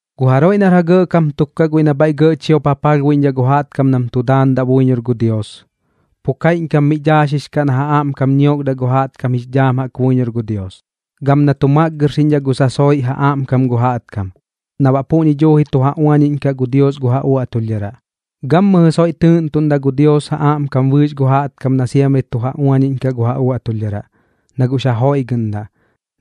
Gu jaroiꞌ nar ja gɇꞌkam tuk kaꞌ guiꞌ nam bhaiꞌ gɇꞌ chiop ja palhbuiꞌñdhaꞌ gu jaꞌtkam nam tu daandaꞌ buiñor gu Dios, pu kaiꞌñkam mi daaxix kaꞌ na ja aꞌmkam ñiokdaꞌ gu jaꞌtkam jix dhaam jaꞌk buiñor gu Dios, gam na tu makgɨrxiꞌñdhaꞌ gu sasoiꞌ ja aꞌmkam gu jaꞌtkam, na baꞌ puꞌñi duuji tu ja uañiꞌñkaꞌ gu Dios gu ja uaꞌtulhdharaꞌ. Gammɨjɨ soiꞌ tɨɨꞌntuꞌndaꞌ gu Dios ja aꞌmkam bɨɨx gu jaꞌtkam na siamri tu ja uañiꞌñkaꞌ gu ja uaꞌtulhdharaꞌ, na guꞌx ja joiꞌgɨꞌndaꞌ,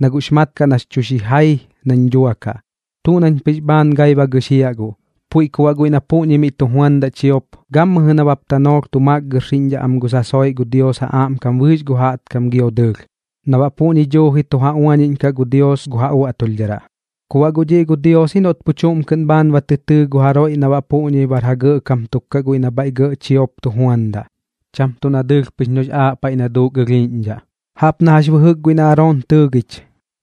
na guꞌx mat kaꞌ nax chu xijai nañ duakaꞌ, tuꞌ nañ pɨx bhaan gai ba gɨxiaꞌ guꞌ. Puiꞌ ku baꞌ guiꞌ na puꞌñi miꞌ tu juandaꞌ chiop, gammɨjɨ nabap tanoolh tu makgɨrxiꞌñdhaꞌ gu sasoiꞌ gu Dios ja aꞌmkam bɨɨx gu jaꞌtkam gio dɨɨlh, na baꞌ puꞌñi duuji tu ja uañiꞌñkaꞌ gu Dios gu ja uaꞌtulhdharaꞌ. Ku baꞌ guꞌ dhiꞌ gu Dios ji noꞌt pu chuꞌm kɨꞌn bhaan ba tɨ tɨɨ gu jaroiꞌ na baꞌ puꞌñi bar ja gɇꞌkam tuk kaꞌ guiꞌ nam bhaiꞌ gɇꞌ chiop tu juandaꞌ, cham tuꞌ na dɨɨlh pɨx noꞌx aaꞌ paiꞌ na duuk ɨlhiiꞌñdhaꞌ. Jaꞌp na jax bɨjɨk guiꞌ na Aroon tɨɨgich,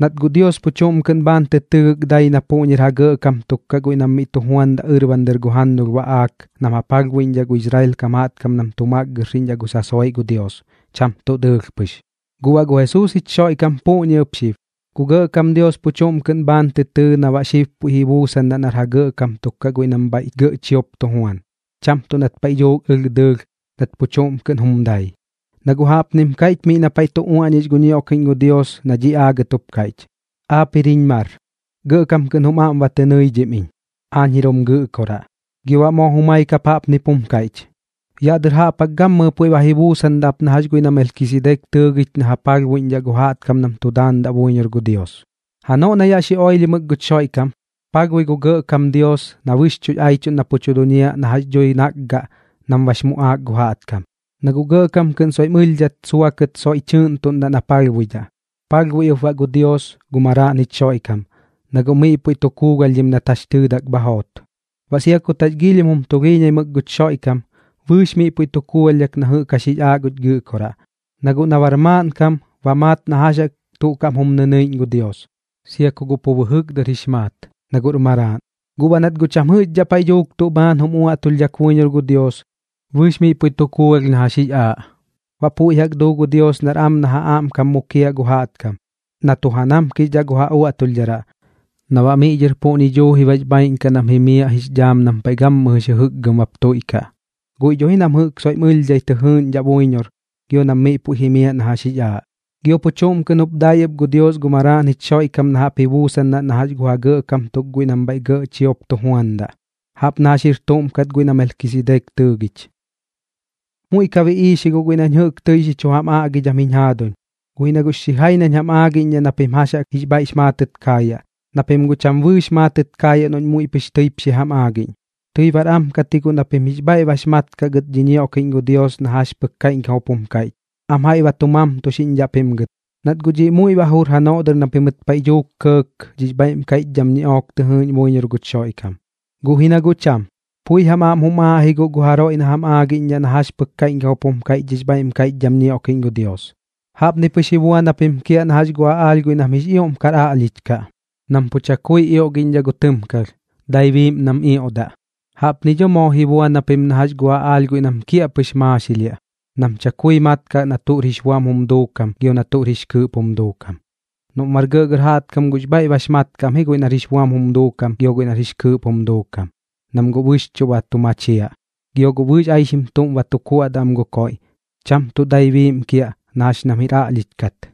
nat guꞌ Dios pu chuꞌm kɨꞌn bhaan tɨ tɨɨgɨk dai na puꞌñir ja gɇꞌkam tuk kaꞌ guiꞌ nam miꞌ tu juandaꞌ ɨrban dɨr gu jannulh baꞌaak nam ja palhbuiꞌñdhaꞌ gu Israel kam jaꞌtkam nam tu makgɨrxiꞌñdhaꞌ gu sasoiꞌ gu Dios, cham tuꞌ dɨɨlh pɨx. Guꞌ baꞌ gu Jesuus jich Xoiꞌkam puꞌñi ɨp xib, gu Gɇꞌkam Dios pu chuꞌm kɨꞌn bhaan tɨ tɨɨ na baꞌ xib puiꞌ ji buusandaꞌ nar ja gɇꞌkam tuk kaꞌ guiꞌ nam bhaiꞌ gɇꞌ chiop tu juan, cham tuꞌ nat paiꞌ dhuuk ɨlh dɨɨlh nat pu chuꞌm kɨꞌn jum dai. Na guꞌ jaꞌpnim kaiꞌch miꞌ na paiꞌ tu uaꞌñix gu ñioꞌkiꞌñ gu Dios na dhiꞌ aagɨt jup kaiꞌch: Aap jir jiñ mar, gɇꞌkam kɨꞌn jum aꞌm ba tɨ nɨidhim iñ. Aañ jir jum gɨꞌkoraꞌ. Gio baꞌ moo jumai kap jaꞌpnip jum kaiꞌch: Yaꞌ dɨr jaꞌp jaꞌk gammɨjɨ puiꞌ ba ji buusandaꞌ ap na jax guiꞌ na Melkisidek tɨɨgich na ja palhbuiꞌñdhaꞌ gu jaꞌtkam nam tu daandaꞌ buiñor gu Dios. Janoꞌ na yaꞌ xi oilhimɨk guch Xoiꞌkam, palhbui gu Gɇꞌkam Dios na bɨxchuꞌx aichuꞌn na pu duñiaꞌ na jax dhui nakgaꞌ nam bax muꞌaak gu jaꞌtkam, na guꞌ gɇꞌkam kɨꞌn soiꞌm ɨlhdhat suakɨt soiꞌ tɨɨꞌntuꞌndaꞌ na palhbuidhaꞌ. Palhbui ɨp baꞌ gu Dios gu Maraaꞌn jich Xoiꞌkam, na guꞌ miꞌ puiꞌ tu kuugalhdhim nat jax tɨɨdak bha joot. Baꞌ sia kut jax giilhim jum tulhiiñaimɨk guch Xoiꞌkam, bɨɨx miꞌ puiꞌ tu kuugalhdhak na jɨꞌk jax jix aaꞌ guch Gɨꞌkoraꞌ. Na guꞌ na bar maaꞌnkam, ba maat na jax jaꞌk tuꞌ kaꞌm jum nɨnɨiꞌñ gu Dios, sia ku guꞌ pu bɨjɨk dɨr jix maat, na guꞌr Maraaꞌn. Guꞌ baꞌ nat guꞌ cham jɨꞌxdhaꞌ paiꞌ dhuuk tuꞌ bhaan jum uaꞌtulhdhak buiñor gu Dios, bɨɨx miꞌ puiꞌ tu kuugalh na jax jix aaꞌ, baꞌ puiꞌ jaꞌk duu gu Dios nar am na ja aꞌmkam mukiaꞌ gu jaꞌtkam, na tu ja namkixdhaꞌ gu ja uaꞌtulhdharaꞌ, na baꞌ miꞌ dhɨr puꞌñi duuji bax bhaaiꞌn kaꞌ nam jimiaꞌ jix dhaam nam paiꞌ gammɨjɨx jɨjɨkgɨm bap tuiꞌkaꞌ, guiꞌ dho ji nam jɨꞌk soiꞌm ɨlhdhai tɨ jɨɨꞌñdhaꞌ buiñor gio nam miꞌ puiꞌ jimiaꞌ na jax jix aaꞌ. Gio pu chuꞌm kɨꞌn jup dai ɨp gu Dios gu Maraaꞌn jich Xoiꞌkam na jaꞌp ji buusandaꞌ na gu ja gɇꞌkam tuk guiꞌ nam bhaiꞌ gɇꞌ chiop tu juandaꞌ, jaꞌp na jax jir tuꞌm kat guiꞌ na Melkisidek tɨɨgich. Muiꞌ ka biꞌiix ji guꞌ guiꞌ nañ jɨꞌk tɨi xi chu jam aꞌgidham jiñ jaaduñ, guꞌ ji na guꞌx xijai nañ jam aagiꞌñdhaꞌ na pim jax jaꞌk jix bhaiꞌx maatɨt kaayaꞌ, na pim guꞌ cham bɨɨx maatɨt kaayaꞌ noꞌñ muiꞌ pɨx tɨip xi jam aagiꞌñ. Tɨi bar am kat ji guꞌ na pim jix bhaiꞌ bax mat kaꞌ gɨt dhi ñioꞌkiꞌñ gu Dios na jax pɨk kaiꞌñkam jup jum kaiꞌch, am jaiꞌ ba tu mamtuxiꞌñdhaꞌ pim gɨt, nat guꞌ dhiꞌ muiꞌ ba jur janoꞌ dɨr na pimɨt paiꞌ dhuuk kɇɇk dhix bhaiꞌm kaiꞌchdham ñiꞌook tɨ jɨɨꞌñ buiñor guch Xoiꞌkam. Guꞌ ji na guꞌ cham, pui jam aꞌm jum aaꞌ ji guꞌ na jaroiꞌ jam aagiꞌñdhaꞌ na jax pɨk kaiꞌñkam jup jum kaiꞌch dhix bhaiꞌm kaiꞌchdham ñioꞌkiꞌñ gu Dios. Jaꞌpni pɨx ji buan japim kiaꞌ na jax gu aꞌaalh guiꞌ nam jix ioꞌm kar aꞌlhich kaꞌ, nam pu chakui ioꞌgiꞌñdhaꞌ gu tɨmkalh, dai biiꞌm nam ioꞌdaꞌ. Jaꞌpni dho moo ji buan japim na jax gu aꞌaalh guiꞌ nam kiaꞌpɨx maaxilhiaꞌ, nam chakui mat kaꞌ na tuꞌr jix buam jum duukam gio na tuꞌr jix kɨɨꞌp jum duukam. Noꞌm bar gɇꞌgɇr jaꞌtkam guꞌx bhaiꞌ bax mat kaꞌ am ji guiꞌ nar jix buam jum duukam gio guiꞌ nar jix kɨɨꞌp jum duukam, nam guꞌ bɨxchuꞌ ba tu machiaꞌ. Gio guꞌ bɨɨx aixim tuꞌm ba tu kuaꞌdaꞌ am gu koiꞌ, cham tuꞌ dai biiꞌm kiaꞌ na jax nam jir aꞌlhich kat.